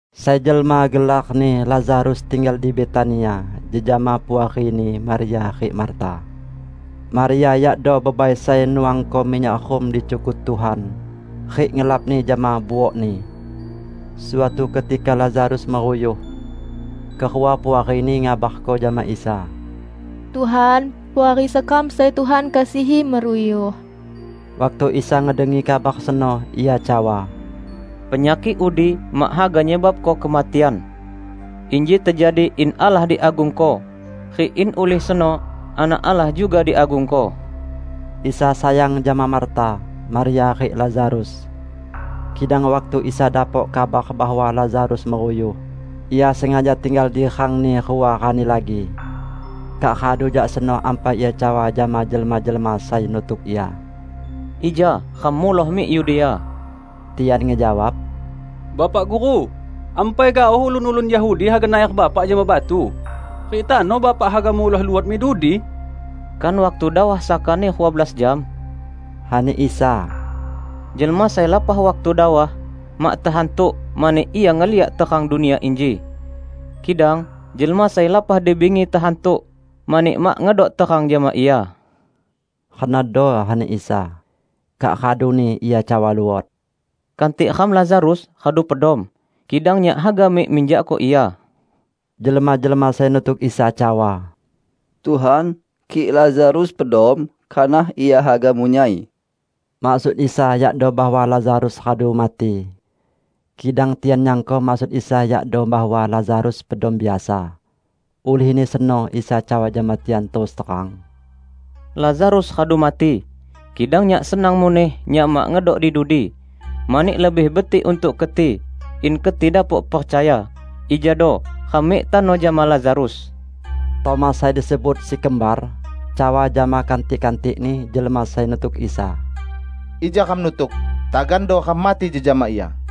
Sai jelma gelarni Lazarus tinggal di Betania jejama puarini Maria rik Marta. Maria yakdo bebai sai nuangko minyak rum di cukut Tuhan, rik ngelapni jama buokni. Suatu ketika Lazarus meruyuh. Kerua puarini ngabarko jama Isa, "Tuhan, puari sekam sai Tuhan kasihi meruyuh." Waktu Isa ngedengi kabar seno, Ia cawa, "Penyakik udi mak haga nyebabko kematian. Inji tejadi in Allah diagungko, rik in ulih seno Anak Allah juga diagungko." Isa sayang jama Marta, Maria rik Lazarus. Kidang waktu Isa dapok kabar bahwa Lazarus meruyuh, Ia sengaja tinggal di rang-Ni rua rani lagi. Kak radu jak seno ampai Ia cawa jama jelma-jelma sai nutuk Ia, "Ija ram muloh mik Yudea." Tian ngejawab, "Bapak Guru, ampai gaoh ulun-ulun Yahudi haga nayar Bapak jama batu rik tano Bapak haga muloh luot mik dudi?" "Kan waktu dawah sakani rua belas jam?" ani Isa. "Jelma sai lapah waktu dawah, mak tehantuk mani ia ngeliak terang dunia inji. Kidang jelma sai lapah di bingi tehantuk, mani mak ngedok terang jama ia." Renodo ani Isa. Kak raduni Ia cawa luot, "Kantik ram Lazarus radu pedom, kidang Nyak haga mik minjakko ia." Jelma-jelma sai nutuk Isa cawa, "Tuhan, kik Lazarus pedom, kanah ia haga munyai." Maksud Isa yakdo bahwa Lazarus radu mati. Kidang tian nyangko maksud Isa yakdo bahwa Lazarus pedom biasa. Ulihni seno Isa cawa jama tian terus terang, "Lazarus radu mati. Kidang Nyak senang muneh Nyak mak ngedok di dudi, mani lebih betik untuk keti, in keti dapok percaya. Ijado ram mik tano jama Lazarus." Tomas sai disebut "Si Kembar" cawa jama kantik-kantikni jelma sai nutuk Isa, "Ija ram nutuk, tagando ram mati jejama Ia."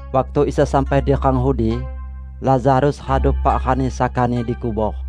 Waktu Isa sampai di rang udi, Lazarus radu epak rani sakani dikubor.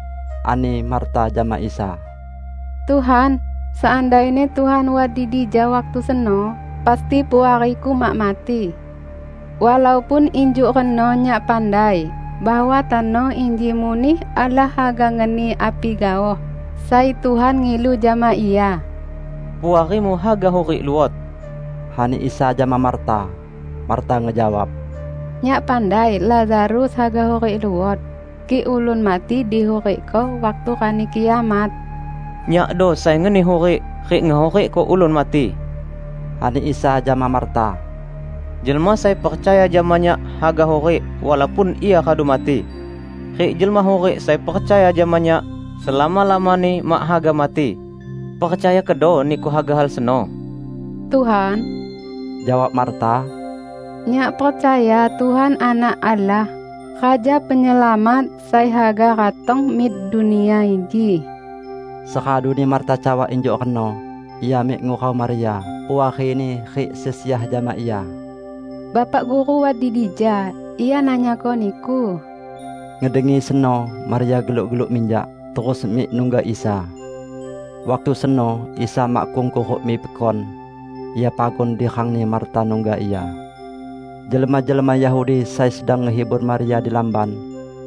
Ani Marta jama Isa, "Tuhan, seandaini Tuhan wat di dija waktu seno, pasti puariku mak mati. Walaupun injuk reno nyak pandai bahwa tano inji muneh Allah haga ngeni api gaoh sai Tuhan ngilu jama Ia." "Puarimu haga hurik luot," ani Isa jama Marta. Marta ngejawab, "Nyak pandai Lazarus haga hurik luot kik ulun mati dihurikko waktu Rani Kiamat." "Nyakdo sai ngeni hurik rik ngehurikko ulun mati," ani Isa jama Marta. "Jelma sai percaya jama Nyak haga hurik, walaupun ia radu mati. Rik jelma hurik sai percaya jama Nyak, selama-lamani mak haga mati. Percaya kedo niku haga hal seno?" "Tuhan," jawab Marta, "nyak percaya Tuhan Anak Allah, Raja Penyelamat sai haga ratong mik dunia inji." Seraduni Marta cawa injuk reno, ia mik ngurau Maria, puarini rik sesiah jama ia, "Bapak Guru wat di dija; Ia nanyako niku." Ngedengi seno, Maria geluk-geluk minjak, terus mik nungga Isa. Waktu seno, Isa makkung kuruk mik pekon. Ia pagun di rangni Marta nungga Ia. Jelma-jelma Yahudi sai sedang ngehibur Maria di lamban,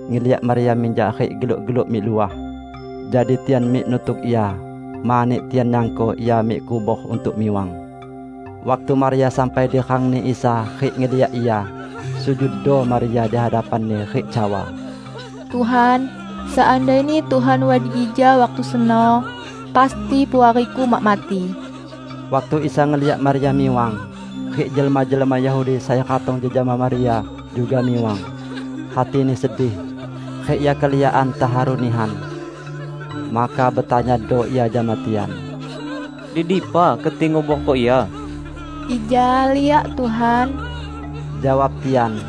ngeliak Maria minjak rik geluk-geluk mik luah; jadi tian mik nutuk ia, mani tian nyangko ia mik kubor untuk miwang. Waktu Maria sampai di rangni Isa rik ngeliak Ia, sujuddo Maria di hadapan-Ni rik cawa, "Tuhan, seandaini Tuhan wat di dija waktu seno, pasti puariku mak mati." Waktu Isa ngeliak Maria miwang, rik jelma-jelma Yahudi sai ratong jejama Maria juga miwang, hati-Ni sedih, rik Ia keliakan teharu nihan. Maka betanyado Ia jama tian, "Di dipa keti nguborko ia?" "Ija liak Tuhan," jawab tian.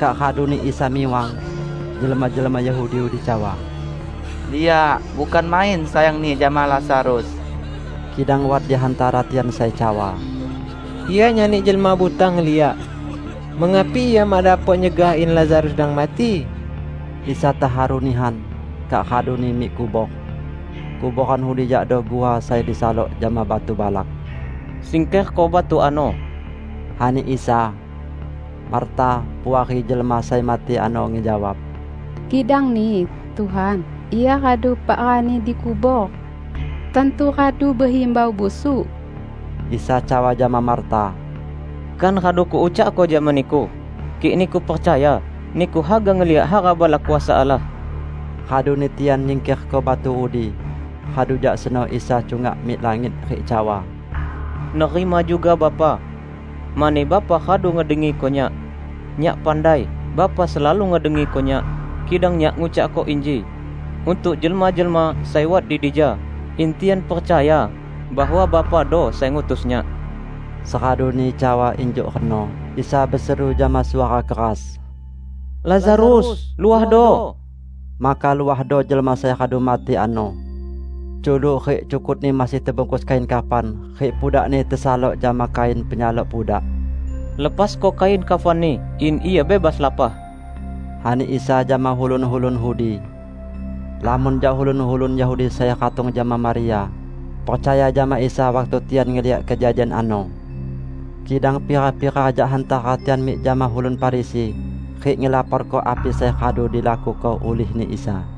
Kak raduni Isa miwang. Jelma-jelma Yahudi udi cawa, "Liak, bukan main sayang-Ni jama Lazarus!" Kidang wat di hantara tian sai cawa, "Ia nyani jelma buta ngeliak, mengapi Ia mak dapok nyegah in Lazarus dang mati?" Isa teharu nihan, kak raduni mik kubor. Kuboran udi yakdo guha sai disalok jama batu balak. "Singkerko batu ano," ani Isa. Marta, puari jelma sai mati ano, ngejawab, "Kidangni, Tuhan, ia radu epak rani dikubor. Tantu radu behimbau busuk!" Isa cawa jama Marta, "Kan radu Kuucakko jama niku: Kik niku percaya, niku haga ngeliak hara balak kuasa Allah!" Raduni tian nyingkerko batu udi. Radu jak seno Isa cungak mik langit rik cawa, "Nerima juga Bapa, mani Bapa radu ngedengiko Nyak. Nyak pandai Bapa selalu ngedengiko Nyak, kidang Nyak ngucakko inji, untuk jelma-jelma sai wat di dija; in tian percaya bahwa Bapado sai ngutus Nyak." Seraduni cawa injuk reno, Isa beseru jama suara keras, "Lazarus, luahdo!" Maka luahdo jelma sai radu mati ano. Culuk rik cukutni masih tebungkus kain kafan, rik pudakni tesalok jama kain penyalok pudak. "Lepasko kain kafanni in ia bebas lapah," ani Isa jama ulun-ulun udi. Lamon jak ulun-ulun Yahudi sai ratong jama Maria, percaya jama Isa waktu tian ngeliak kejadian ano. Kidang pira-pira jak hantara tian mik jama ulun Farisi rik ngelaporko api sai radu dilakuko ulihni Isa.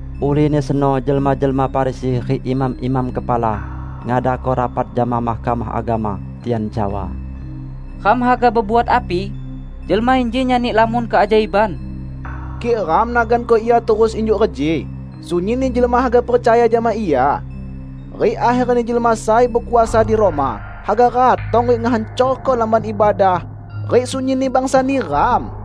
Ulihni seno jelma-jelma Farisi rik imam-imam kepala ngadako rapat jama Mahkamah Agama. Tian cawa, "Ram haga bebuat api? Jelma inji nyani lamon keajaiban! Kik ram naganko Ia terus injuk reji sunyinni jelma haga percaya jama Ia. Rik akherni jelma sai bekuasa di Roma haga ratong rik ngehancorko Lamban Ibadah rik sunyinni bangsa neram!"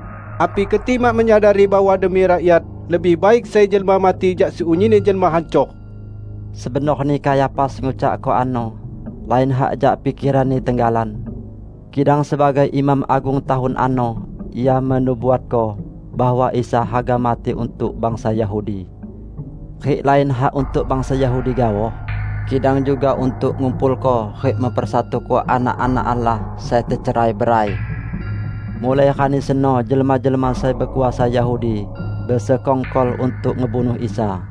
Api keti mak menyadari bahwa demi rakyat, lebih baik sai jelma mati jak sunyinni jelma hancor?" Sebenorni Kayafas ngucakko ano, lain hak jak pikeranni tenggalan. Kidang sebagai imam agung tahun ano ia menubuatko bahwa Isa haga mati untuk bangsa Yahudi. Rik lain hak untuk bangsa Yahudi gaoh, kidang juga untuk ngumpulko rik mempersatuko anak-anak Allah sai tecerai-berai. Mulai rani seno jelma-jelma sai bekuasa Yahudi besekongkol untuk ngebunuh Isa.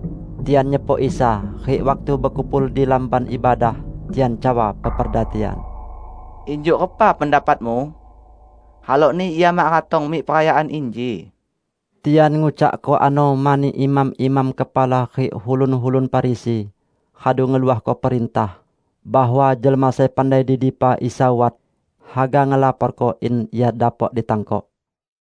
Tian nyepok Isa, rik waktu bekumpul di Lamban Ibadah, tian cawa peperda tian, "Injuk repa pendapatmu? Halokni Ia mak ratong mik perayaan inji." Tian ngucakko ano mani imam-imam kepala rik ulun-ulun Farisi radu ngeluahko perintah bahwa jelma sai pandai di dipa Isa wat, haga ngelaporko in Ia dapok ditangkok.